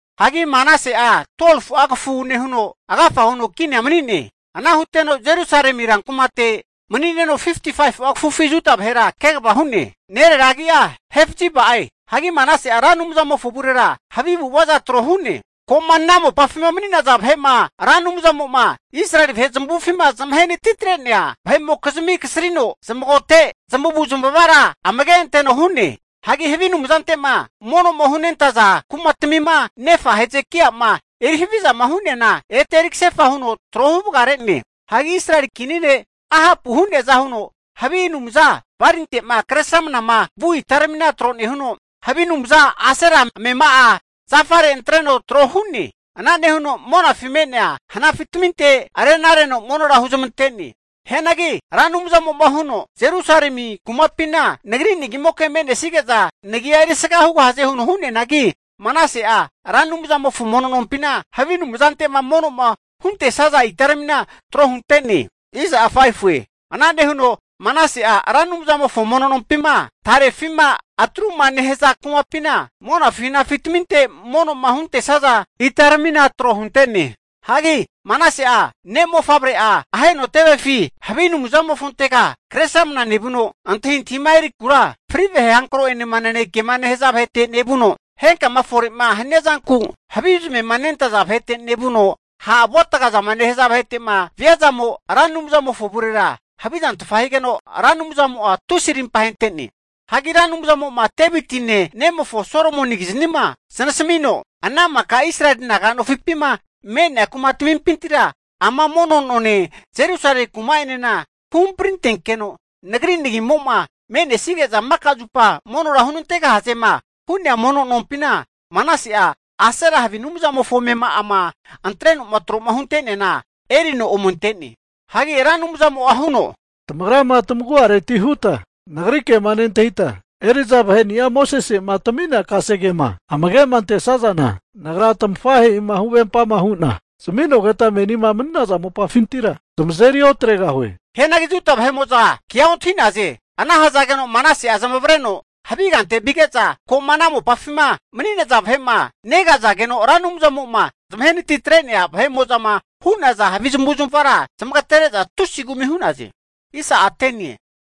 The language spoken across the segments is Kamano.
Hagi Manase'a 12fu'a kafu nehuno, agafa huno kinia mani'ne. Ana huteno Jerusalemi rankumate mani'neno 55'a kafufi Juda vahera kegava hu'ne. Nerera agi'a Hefziba'e. Hagi Manase'a Ra Anumzamofo avurera havi avu'avaza tro hu'ne. Ko'ma ana mopafima mani'naza vahe'ma Ra Anumzamo'ma Israeli vahe zamavufima zamahe natitre'nea vahe'mokizmi kasrino zamagote zamavu zamavara zamage anteno hu'ne. Hagi havi anumzante'ma mono'ma hunentaza kumatmima nefa' Hezekai'ama eri havizama huneana, ete eri kasefa huno tro huvagare'ne. Hagi Israeli kini ne' Ahapu hu'neaza huno, havi anumza Balinte'ma kresramnama vu itaramina tro nehuno, havi anumza Asera amema'a zafare antreno trohu'ne. Ana nehuno monafi me'nea hanafitaminte rena reno monora huzmante'ne. Hianagi Ra Anumzamo'ma huno, Jerusalemi kumapina Nagri nagimoke me'nesige'za Nagia erisga hugahaze huno hu'neanagi, Manase'a Ra Anumzamofo mono nompina havi anumzante'ma mono'ma huntesaza itaramina tro hunte'ne. Ana nehuno Manase'a Ra Anumzamofo mono nompima, tarefima atruma nehaza kumapina, monafi hanafitaminte mono'ma huntesaza itaramina tro hunte'ne. Hagi Manase'a ne'mofavre'a aheno tevefi havi anumzamofontega kresramna nevuno, antahintahima erikura, fri vahe hankro'enema nanekema nehaza vahete nevuno, henkama fore'ma haniazanku havi zamema nentaza vahete nevuno, ha' avu'atgaza nehaza vahete'ma viazamo'a, Ra Anumzamofo avurera havizantfa higeno, Ra Anumzamo'a tusi arimpa ahente'ne. Hagi Ra Anumzamo'ma Devitine ne'mofo Solomonikiznima zanasamino, ana maka Israeli naga nofipima me'nea kumatamimpintira, ama mono none Jerusale kuma'enena huhamprintoankino, Nagri nagimo me'nesige'za maka zupa monora hunantegahazema hu'nea mono nompina, Manase'a Asera havi anumzamofo amema'ama antreno'ma tro'ma hunte'neana erino ome ante'ne. Hagi Ra Anumzamo'a huno, Tamagrama tamagu'areti huta nagri kema nentahita, eri'za vaheni'a Mosese'ma tami'nea kasegema amage'ma antesazana, Nagra tamafahe'ima huvempama hu'na zami'nogeta menima mani'naza mopafintira tamazeri otregahue. Hianagi Juda vahe'mo'za kea ontahi'naze. Ana hazageno Manase'a zamavareno havi kante vige'za, ko'ma ana mopafima mani'naza vahe'ma, negazageno Ra Anumzamo'ma zamahenati atre'nea vahe'mo'zama hu'naza havi zamavu zamavara zamagtere'za tusi kumi hu'naze.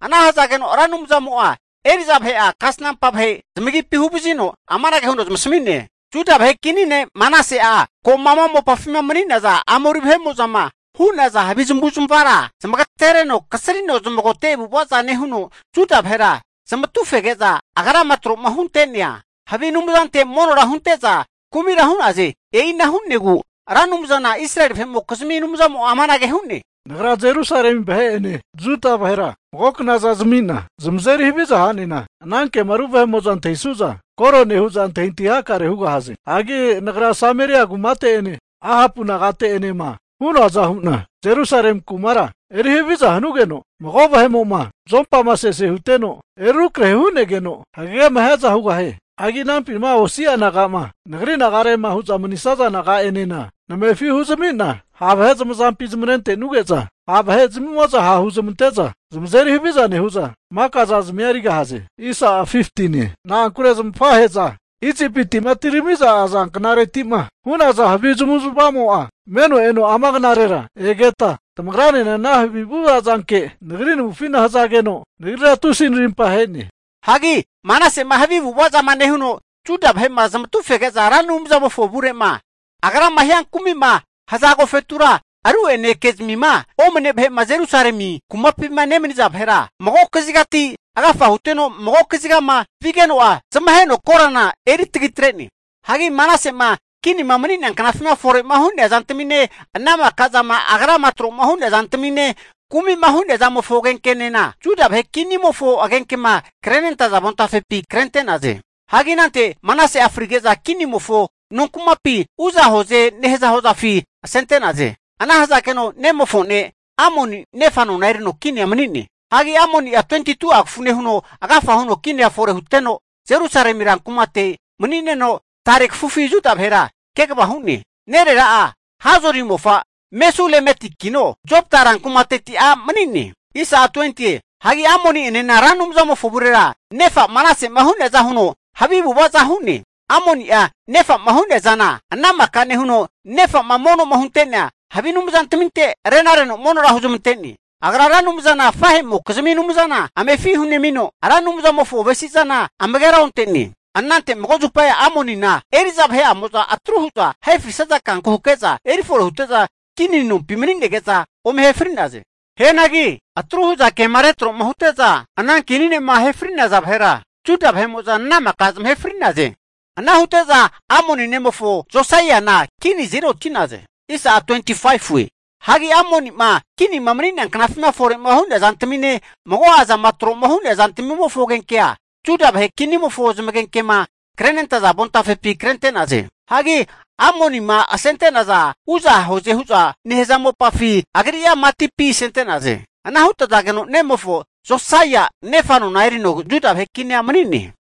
Ana hazageno Ra Anumzamo'a eri'za vahe'a kasnampa vahe zamagipi huvazino amanage huno zamasami'ne, Juda vahe kini ne' Manase'a, ko'ma ana mopafima mani'naza Amori vahe'mo'zama hu'naza havi zamavu zamavara zamagatereno kasrino zamagote avu'avaza nehuno, Juda vahera zamatu fege'za, agrama tro'ma hunte'nea havi anumzante monora hunte'za kumira hu'naze. E'ina hu'negu Ra Anumzana Israeli vahe'mokizmi Anumzamo'a amanage hu'ne, Nagra Jerusalemi vahe'ene Juda vahera mago knaza zami'na zamazeri haviza ha'nena, ana ke'ma ru vahe'mo'zama antahisuza koro nehu'za antahintahi hakare hugahaze. Hagi Nagra Sameria kumate'ene, Ahapu nagate'enema hu'noaza hu'na, Jerusalemi kumara eri haviza hanugeno, mago vahe'mo'ma zuompama sese huteno eri rukrahe hu'negeno hagegema hiaza hugahie. Hagi anampima osi'a naga'ma nagri nagarema hu'za manisaza naga'enena namefi hunezami'na, ha' vahe zamazampi zamatre'nuge'za, ha' vahe'zamimo'za ha' huzmante'za zamazeri haviza nehu'za, maka zazamia erigahaze. Na'ankure zamafahe'za Isipiti'ma etiramiza aza knareti'ma hu'naza havi zamavu zamava zamo'a meme eno ama knarera egeta, tamagranena ana havi avu'avazanke nagri navufi hazageno, Nagrira tusi narimpa ahe'ne. Hagi Manase'ma havi avu'avaza nehuno, Juda vahe'ma zamatu fege'za Ra Anumzamofo avure'ma, agrama hia kumi'ma haza agofetura, ru'ene ke'zamima omne vahe'ma Jerusalemi kumapina nemaniza vahera, mago kazigati agafa huteno vuno mago kazigama vigeno'a, zamaheno korana eri tagitre'ne. Hagi Manase'ma kinima mani'nea knafima fore'ma hu'nea zantamine, ana maka zama agrama tro'ma hu'nea zantamine, kumi'ma hu'nea zamofo agenkenena, Juda vahe kinimofo agenkema krenentaza avontafepi krente'naze. Hagi anante Manase'a frige'za kinimofo nonkumapi, Uza hoze nehaza hozafi asente'naze. Ana hazageno nemofo ne' Amoni nefa nona erino kinia mani'ne. Hagi Amoni'a 22'a kafu nehuno agafa huno kinia fore huteno, Jerusalemi ran kumate mani'neno tare kafufi Juda vahera kegava hu'ne. Nerera'a Haruzi mofa Mesulemetikino, Jotba ran kumateti a' mani'ne. Hagi Amoni'enena Ra Anumzamofo avurera, nefa Manase'ma hu'neaza huno, havi avu'avaza hu'ne. Amoni'a nefa'ma hu'nea zana ana maka nehuno, nefa'ma mono'ma hunte'nea havi anumzantaminte rena reno monora huzmante'ne. Agra Ra Anumzana afahe'mokizmi Anumzana amefi hunemino, Ra Anumzamofo avesi'zana amagera onte'ne. Anante mago zupa Amonina eri'za vahe'amo'za, atru hu'za ahe frisaza kanku hake'za erifore hute'za, kini nompi mani'nege'za ome ahe fri'naze. Hianagi atru hu'za kema retro'ma hute'za ana kini ne'ma ahe fri'naza vahera, Juda vahe'mo'za ana maka zamahe fri'naze. Ana hute'za Amoni nemofo Josaiana kini azeri oti'naze. Hagi Amoni'ma kinima mani'nea knafima fore'ma hu'nea zantamine, mago'a zama tro'ma hu'nea zantamimofo agenkea, Juda vahe kinimofo zamagenkema krenentaza avontafepi krente'naze. Hagi Amonima asente'nazana, Uza hoze hu'za nehaza hozafi agri'a matipi asente'naze. Ana hutazageno nemofo Josaia nefa nona erino Juda vahe kinia mani'ne.